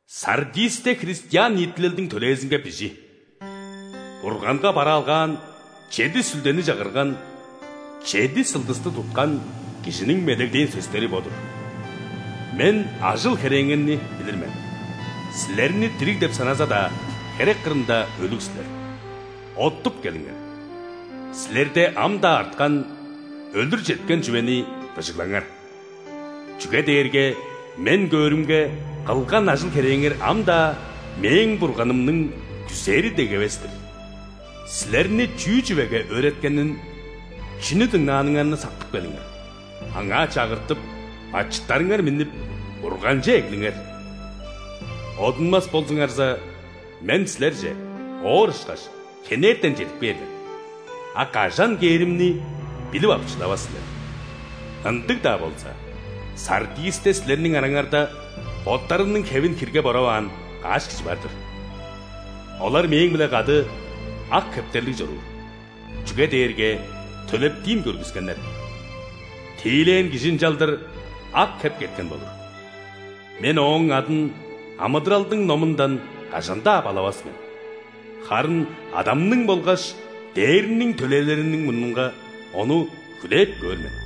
«Сардисте христиан ниитилелдиң төлээзинге бижи: Бурганга бараалгаан чеди сүлдени чагырган, чеди сылдысты туткан Кижиниң медеглээн сөстери бо-дур. Мен ажыл-херээңерни билир мен. Силерни дириг деп саназа-даа, херек кырында өлүг силер. Оттуп келиңер! Силерде ам-даа арткан, өлүр четкен чүвени быжыглаңар. Чүге дээрге, Мен көөрүмге, кылган ажыл-херээңер ам-даа Мээң Бурганымның күзээри дег эвес-тир. Силерни чүү чүвеге өөреткенин, чүнү дыңнааныңарны сактып келиңер, аңаа чагыртып, бачыттарыңар миннип, Бурганче эглиңер! Одунмас болзуңарза, Мен силерже, оор ышкаш, хенертен чедип кээр мен. А кажан кээримни билип ап шыдавас силер. Ындыг-даа болза, Сардисте силерниң араңарда боттарының хевин хирге бораваан каш кижи бар-дыр. Олар Мээң-биле кады ак хептерлиг чоруур, чүге дээрге төлептиин көргүскеннер. Тиилээн кижи ынчалдыр ак хептер кеткен болур. Мен ооң адын амыдыралдың номундан кажан-даа балавас мен. Харын Адамның болгаш ·дээрниң төлээлериниң мурнунга ону хүлээп көөр мен.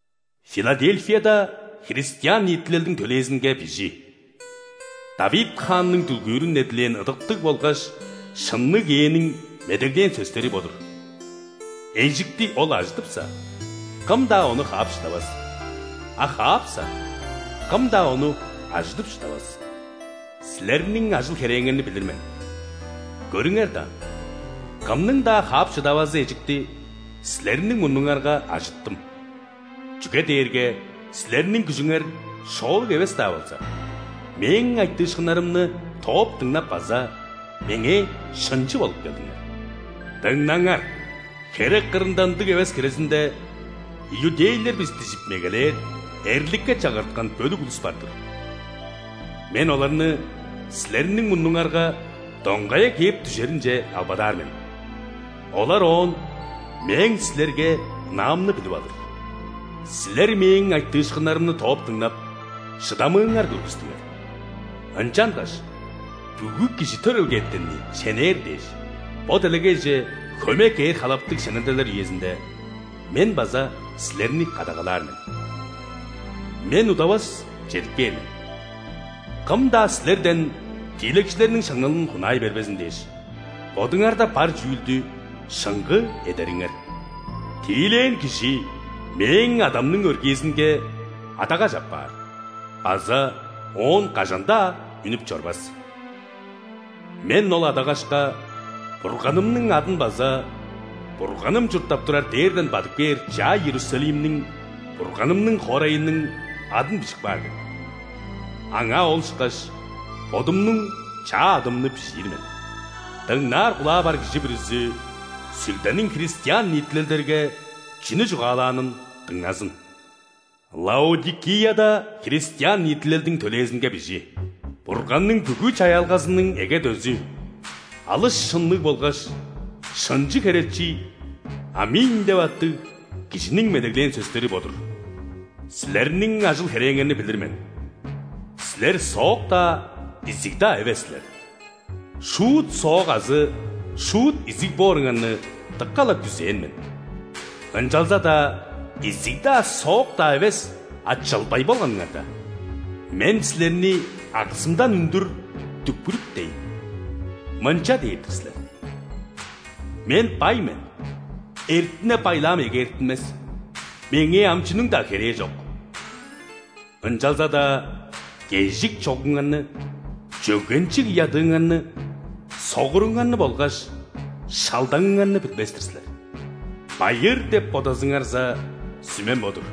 «Филадельфияда христиан ниитилелдиң төлээзинге бижи: ·Давид хаанның дүлгүүрүн эдилээн ыдыктыг болгаш шынныг Ээниң медеглээн сөстери бо-дур. Эжикти ол ажыдыпса, кым-даа ону хаап шыдавас, а хаапса, кым-даа ону ажыдып шыдавас. Силерниң ажыл-херээңерни билир мен. Көрүңер даан, кымның-даа хаап шыдавазы эжикти силерниң мурнуңарга ажыттым, чүге дээрге силерниң күжүңер шоолуг эвес-даа болза, Мээң айтыышкыннарымны тооп дыңнап база Меңээ шынчы болуп келдиңер. Дыңнаңар! Херек кырында ындыг эвес хирезинде, иудейлер бис дижип мегелээр, эрликке чагырткан бөлүк улус бар-дыр. Мен оларны силерниң мурнуңарга доңгая кээп дүжеринче албадаар мен, олар оон Мээң силерге ынаамны билип алыр. Силер Мээң айтыышкыннарымны тооп дыңнап, шыдамыыңар көргүстүңер. Ынчангаш бүгү кижи төрелгетенни шенээр дээш, бо делегейже хөме кээр халаптыг шенелделер үезинде Мен база силерни кадагалаар мен. Мен удавас чедип кээр мен. Кым-даа силерден тиилекчилерниң шаңналын хунаай бербезин дээш, бодуңарда бар чүүлдү шыңгыы эдериңер. Тиилээн кижи Мээң Адамның өргээзинге адагаш апаар база оон кажан-даа үнүп чорбас. Мен ол адагашка Бурганымның адын база Бурганым чурттап турар дээрден бадып кээр чаа Иерусалимниң – Бурганымның хоорайының адын бижип каар мен. Аңаа ол ышкаш Бодумнуң чаа адымны бижиир мен. Дыңнаар кулаа бар кижи бүрүзү Сүлдениң христиан ниитилелдерге чүнү чугаалаанын дыңназын». «Лаодикияда христиан ниитилелдиң төлээзинге бижи: Бурганның бүгү чаяалгазының эге дөзү, алыс шынныг болгаш шынчы херечи ·Аминь деп аттыг Кижиниң медеглээн сөстери бо-дур. Силерниң ажыл-херээңерни билир мен. Силер соок-даа, изиг-даа эвес силер. Шуут соок азы шуут изиг бооруңарны дыка-ла күзээн мен! Ынчалза-даа изиг-даа, соок-даа эвес, а чылбай болганыңарда, Мен силерни аксымдан үндүр дүкпүрүптейн! Мынча дээр-дир силер: „Мен бай мен, эртине-байлаам эгээртинмес, меңээ ам чүнүң-даа херээ чок“. Ынчалза-даа кежик чогуңарны, чөгенчиг ядыыңарны, согуруңарны болгаш шалдаңыңарны билбес-тир силер. Байыыр деп бодазыңарза, сүмем бо-дур: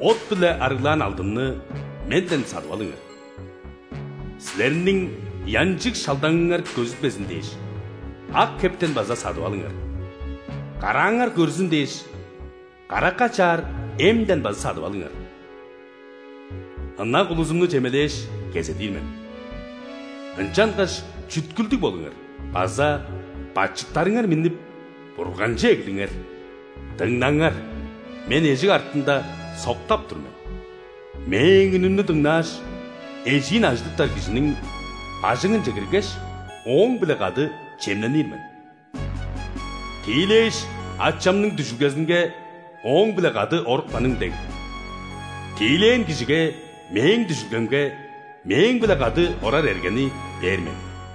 от-биле арыглаан алдынны Менден садып алыңар. Силерниң ыянчыг шалдаңыңар көзүлбезин дээш, ак хептен база садып алыңар. Карааңар көрзүн дээш, каракка чаар эмден база садып алыңар. Ынак улузумну чемелээш, кезедир мен. Ынчангаш чүткүлдүг болуңар база бачыттарыңар миннип, Бурганче эглиңер. Дыңнаңар, Мен эжик артында соктап тур мен. Мээң үнүмнү дыңнааш, эжиин ажыдыптар кижиниң бажыңынче киргеш, ооң-биле кады чемненир мен. Тиилээш, Ачамның дүжүлгезинге Ооң-биле кады орупканым дег, тиилээн кижиге Мээң дүжүлгемге Мээң-биле кады орар эргени бээр мен.